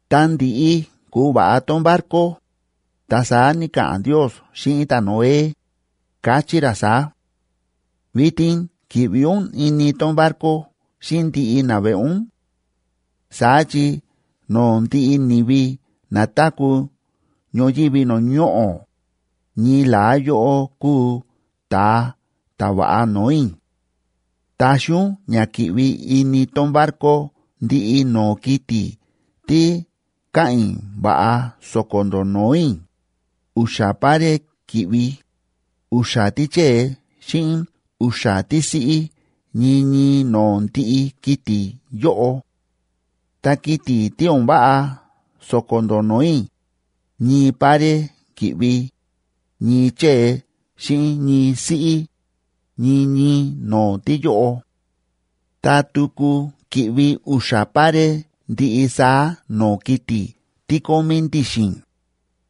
Ta ndi̱ꞌi ku̱va̱ꞌa tón barco, ta saá ni̱ka̱ꞌa̱n Ndiosa xíꞌin ta̱Noé, káchí ra saá: ―Vitin ki̱ꞌvi ún ini tón barco xíꞌin ndiꞌi naveꞌe ún. Saá chi no̱o̱ ndiꞌi ni̱vi na táku̱ ñoyívi no̱o̱ ñoꞌo̱, ñii la̱á yóꞌó kúu ta̱a ta̱ va̱ꞌa no̱o̱ i̱. Taxi ún ña ki̱ꞌvi ini tón barco ndiꞌi no̱o̱ kiti̱ tí káꞌa̱n i̱ va̱ꞌa so̱ko̱ ndó no̱o̱ i̱, u̱xa̱ pare ki̱ꞌvi, u̱xa̱ tíchée xíꞌin u̱xa̱ tísiꞌí ñii ñii no̱o̱ ndiꞌi kiti̱ yóꞌo. Ta kiti̱ tí o̱n váꞌa so̱ko̱ ndó no̱o̱ i̱, ñii pare ki̱ꞌvi, ñii chée xíꞌin ñii siꞌí, ñii ñii no̱o̱ tíyóꞌo. Ta tuku ki̱ꞌvi u̱xa̱ pare ndiꞌi saá no̱o̱ kiti̱ tí kómí ndi̱xi̱n,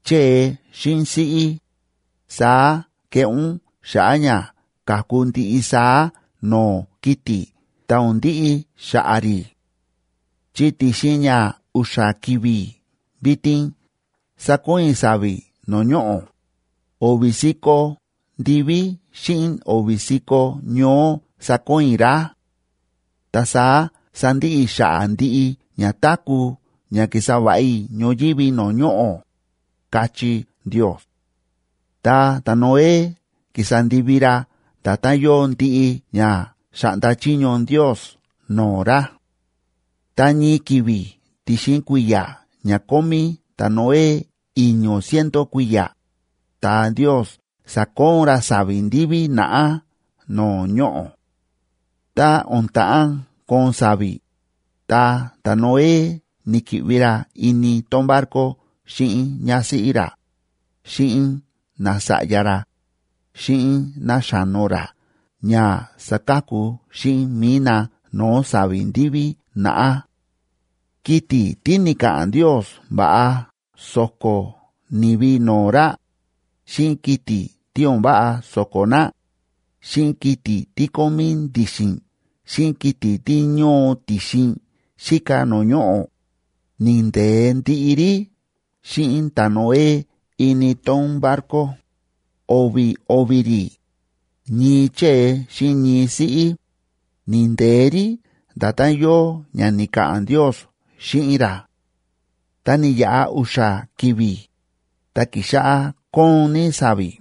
chée xíꞌin siꞌí, saá keꞌé ún xa̱ꞌa̱ ña ka̱ku ndiꞌi saá no̱o̱ kiti̱ ta o̱n ndiꞌi xa̱ꞌa̱ rí. Chi ti̱xin ña u̱xa̱ ki̱vi̱ vitin sakoon i̱ sa̱vi̱ no̱o̱ ñoꞌo̱, o̱vi̱ si̱ko̱ ndiví xíꞌin o̱vi̱ si̱ko̱ ñoó sakoon i̱ rá. Ta saá sandiꞌi i̱ xa̱ꞌa̱ ndiꞌi ña táku̱ ña ki̱sa va̱ꞌa i̱ ñoyívi no̱o̱ ñoꞌo̱ ―káchí Ndios. Ta ta̱Noé ki̱sa ndivi ra nda̱tán yóo ndiꞌi ña xa̱ꞌnda chiño Ndios no̱o̱ ra. Ta ñii ki̱vi̱ ti̱xin kui̱ya̱ ña kómí ta̱Noé i̱ño̱ ciento kui̱ya̱, ta Ndios sa̱koon ra sa̱vi̱ ndiví naꞌá no̱o̱ ñoꞌo̱. Ta o̱n ta̱ꞌán koon sa̱vi̱, ta ta̱Noé ni̱ki̱ꞌvi ra ini tón barco xíꞌin ñásíꞌí ra, xíꞌin nasa̱ꞌya ra, xíꞌin náxa̱no ra ña saka̱ku xíꞌin mi̱i na no̱o̱ sa̱vi̱ ndiví naꞌá. Kiti̱ tí ni̱ka̱ꞌa̱n Ndios va̱ꞌa so̱ko̱ ni̱vi no̱o̱ ra, xíꞌin kiti̱ tí o̱n váꞌa so̱ko̱ na, xíꞌin kiti̱ tí kómí ndi̱xi̱n xíꞌin kiti̱ tí ñóo ti̱xin xíka no̱o̱ ñoꞌo̱, ni̱nde̱e ndiꞌi rí xíꞌin ta̱Noé ini tón barco, o̱vi̱ o̱vi̱ rí, ñii chée xíꞌin ñii siꞌí, ni̱nde̱e rí nda̱tán yóo ña ni̱ka̱ꞌa̱n Ndios xíꞌin ra. Ta ni̱yaꞌa u̱xa̱ ki̱vi̱, ta ki̱xáꞌá kóon ní sa̱vi̱,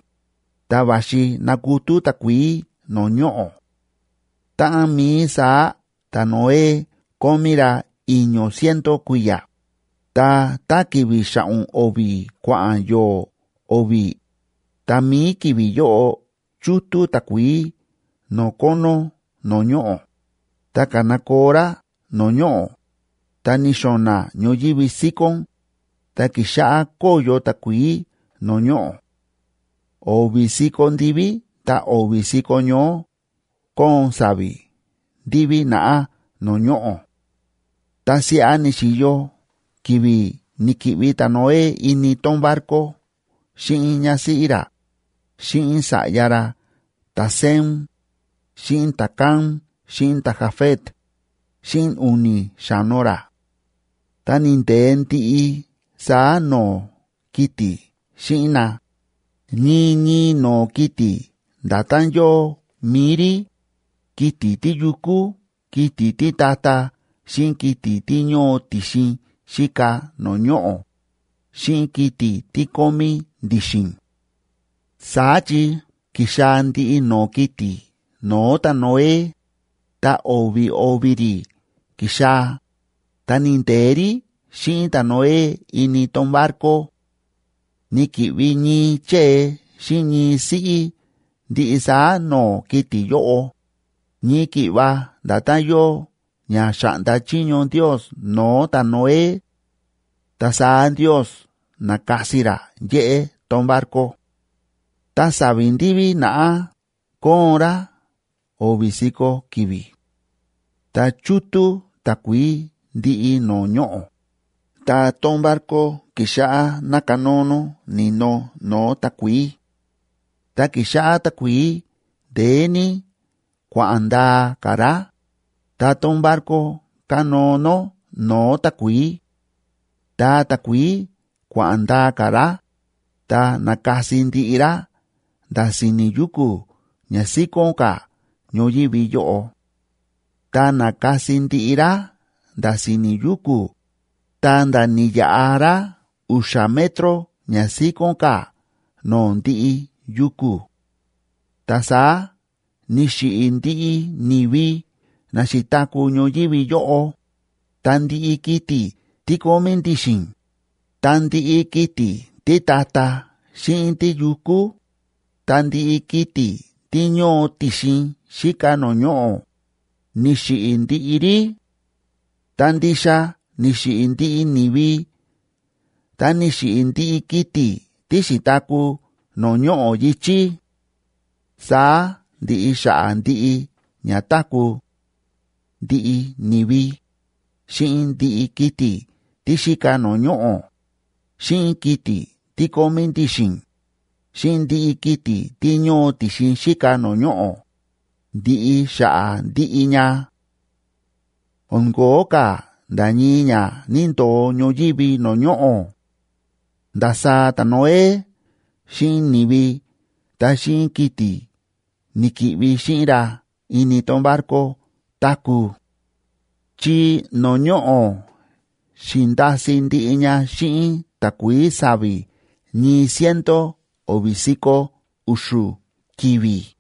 ta va̱xi nakutú takuií no̱o̱ ñoꞌo̱. Táꞌan mií saá ta̱Noé kómí ra i̱ño̱ ciento kui̱ya̱, ta tá ki̱vi̱ xa̱ꞌo̱n o̱vi̱ kua̱ꞌa̱n yo̱o̱ o̱vi̱, tá mií ki̱vi̱ yóꞌo chútú takuií no̱o̱ kónó no̱o̱ ñoꞌo̱, ta ka̱nakoo rá no̱o̱ ñoꞌo̱, ta ni̱xo̱na̱ ñoyívi síkón, ta ki̱xáꞌá kóyo takuií no̱o̱ ñoꞌo̱. O̱vi̱ si̱ko̱ ndiví ta o̱vi̱ si̱ko̱ ñoó kóon sa̱vi̱ ndiví naꞌá no̱o̱ ñoꞌo̱. Ta siꞌa ni̱xi̱yo ki̱vi̱ ni̱ki̱ꞌvi ta̱Noé ini tón barco xíꞌin ñásíꞌí ra, xíꞌin sa̱ꞌya ra ta̱Sem, xíꞌin ta̱Cam xíꞌin ta̱Jafet, xíꞌin u̱ni̱ xa̱no ra. Ta ni̱nde̱e ndiꞌi saá no̱o̱ kiti̱ xíꞌin na, ñii ñii no̱o̱ kiti̱ nda̱tán yóo mi̱i rí, kiti̱ tíyukú, kiti̱ títa̱ta̱, xíꞌin kiti̱ tí ñóo ti̱xin xíka no̱o̱ ñoꞌo̱, xíꞌin kiti̱ tí kómí ndi̱xi̱n. Saá chi ki̱xaa̱ ndiꞌi no̱o̱ kiti̱ no̱o̱ ta̱Noé, ta o̱vi̱ o̱vi̱ rí ki̱xaa̱, ta ni̱nde̱e rí xíꞌin ta̱Noé ini tón barco. Ni̱ki̱ꞌvi ñii chée xíꞌin ñii siꞌí ndiꞌi saá no̱o̱ kiti̱ yóꞌo, ñii ki̱ꞌva nda̱tán yóo ña xa̱ꞌnda chiño Ndios no̱o̱ ta̱Noé. Ta saá Ndios na̱kasi ra yéꞌé tón barco. Ta sa̱vi̱ ndiví naꞌá kóon rá o̱vi̱ si̱ko̱ ki̱vi̱. Ta chútú takuií ndiꞌi no̱o̱ ñoꞌo̱, ta tón barco ki̱xáꞌá nákanóo nó ni̱no no̱o̱ takuií. Ta ki̱xáꞌá takuií ndeé ní kua̱ꞌa̱n ndaa ka̱ rá, ta tón barco kánóo nó no̱o̱ takuií. Ta takuií kua̱ꞌa̱n ndaa ka̱ rá, ta na̱kasi ndiꞌi rá nda̱ si̱ni̱ yuku̱ ña síkón ka̱ ñoyívi yóꞌo. Ta na̱kasi ndiꞌi rá nda̱ si̱ni̱ yuku̱, ta̱nda̱ ni̱yaꞌa rá u̱xa̱ metro ña síkón ka̱ no̱o̱ ndiꞌi yuku̱. Ta saá ni̱xiꞌi̱ ndiꞌi ni̱vi na xi̱taku̱ ñoyívi yóꞌo, ta ndiꞌi kiti̱ tí kómí ndi̱xi̱n, ta ndiꞌi kiti̱ títa̱ta̱ xíꞌin tíyukú, ta ndiꞌi kiti̱ tí ñóo ti̱xin xíka no̱o̱ ñoꞌo̱, ni̱xiꞌi̱ ndiꞌi rí. Ta ndixa ni̱xiꞌi̱ ndiꞌi ni̱vi ta ni̱xiꞌi̱ ndiꞌi kiti̱ tí xi̱taku̱ no̱o̱ ñoꞌo̱ yi̱chí. Saá ndi̱ꞌi xa̱ꞌa̱ ndiꞌi ña táku̱; ndiꞌi ni̱vi, xíꞌin ndiꞌi kiti̱ tí xíka no̱o̱ ñoꞌo̱, xíꞌin kiti̱ tí kómí ndi̱xi̱n, xíꞌin ndiꞌi kiti̱ tí ñóo ti̱xin xíka no̱o̱ ñoꞌo̱, ndi̱ꞌi xa̱ꞌa̱ ndiꞌi ña. O̱n ko̱ó ka̱ nda̱ ñii ña ni̱ndo̱o ñoyívi no̱o̱ ñoꞌo̱. Ndasaá ta̱Noé xíꞌin ni̱vi ta xíꞌin kiti̱ ni̱ki̱ꞌvi xíꞌin ra ini tón barco táku̱. Chi no̱o̱ ñoꞌo̱ xi̱nda̱si̱ ndiꞌi ña xíꞌin takuií sa̱vi̱ ñii ciento o̱vi̱ si̱ko̱ u̱xu̱ ki̱vi̱.